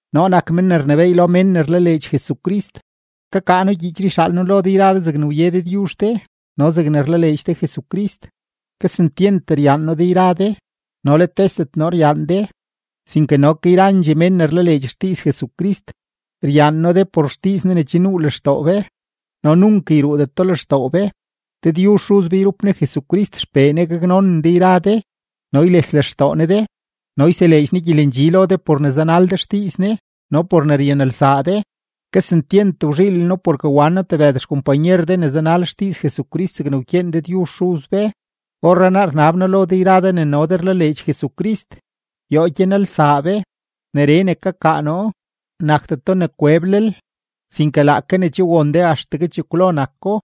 Noo nak men ne rnebééy lo mén ne rlaleedx Jesucrist. Kakaa noo gyiichree yxaal noo lo de yra de zegne wye Dëdyuzh de no zegne rlaleedx de Jesucrist. Kesentyent ryaan noo de yra de, no let tesdet noo ryaan de, sinke no ke yrandxee mén ne rlaleedx xdiiz Jesucrist. Ryaan noo de por xdiiz Ne ne che nuu lextoo be no nunk yruudeto lextoo be. Dëdyuzh Xuz be yrup Ne Jesucrist XPee Ne gaknonen de yra de no yles lextoo Ne de no yseleedx Ne gyelendxi lo de por ne zanal de xdiiz Ne no por ne ryanelsaa de. Kesentyent wzhiilen noo porke wan noo tebëd xkompanyer de ne zanal xdiiz Jesucrist zegne wkyeen Dëdyuzh Xuz be. Orrenaa rnab noo lo de yra de ne no de rlaleedx Jesucrist, yoo gyanelsaa be. Neree ne kakaa noo, nakdeto ne kweblel, sinke laake ne che won be axtegue chekwlo nako.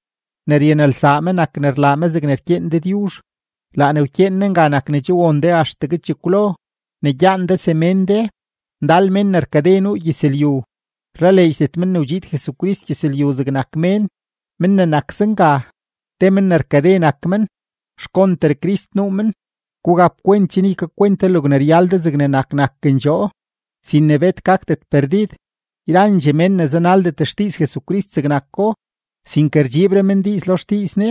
Ne ryanelsaa me nak ne rlaa me zegne rkyeen Dëdyuzh. Laa ne rkyeen Ne nga nak ne che won de axtegue chekwlo, ne gyaan de semén de. Ndal mén ne rkade nuu gyëzlyu, rlaleedxdet men ne wdxiid Jesucrist gyëzlyu zegnak mén. Men ne nak zenga, te mén ne rkade nak men, xkonter Crist nuu men. Gugap kwent chen ykakwent de logne ryal de zegnak nakendxoo sin ne bet gakdet perdid. Yrandxee mén ne zanaldet xdiiz Jesucrist zegnako, sinke rdxiibre men diiz lo xdiiz Ne,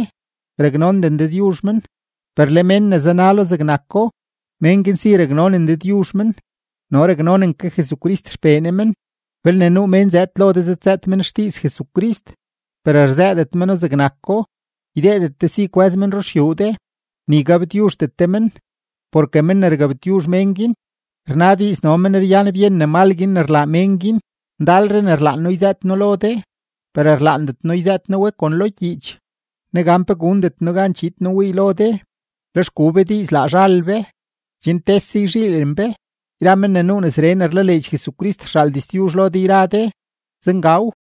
raknonden Dëdyuzh men. Per le mén ne zanalo zegnako, men guin si raknonen Dëdyuzh men no raknonen ke Jesucrist XPee Ne men. Belne nuu mén zëëd lo de zëdzëët men xdiiz Jesucrist, per rzëëdet meno zegnako, ydeedet de si kwë́z men ruxyuu de, ni gabtyuzhdet de men. Porke men ne gabtyuzh mén guin, rna diiz no men ryan byen ne mal guin ne rlaa mén guin. Ndalre ne rlaan noo yzëët noo lo de, per rlaandet noo yzëët noo we kon lo gyiich. Negan pe gundet noo gan chiid noo wii lo de, lex gu be diiz laa zhal be, chen tese yzhiilen be. Yra men ne nuu nesree ne rlaleedx Jesucrist rxaal diztyuzh lo de yra de. Zengaw.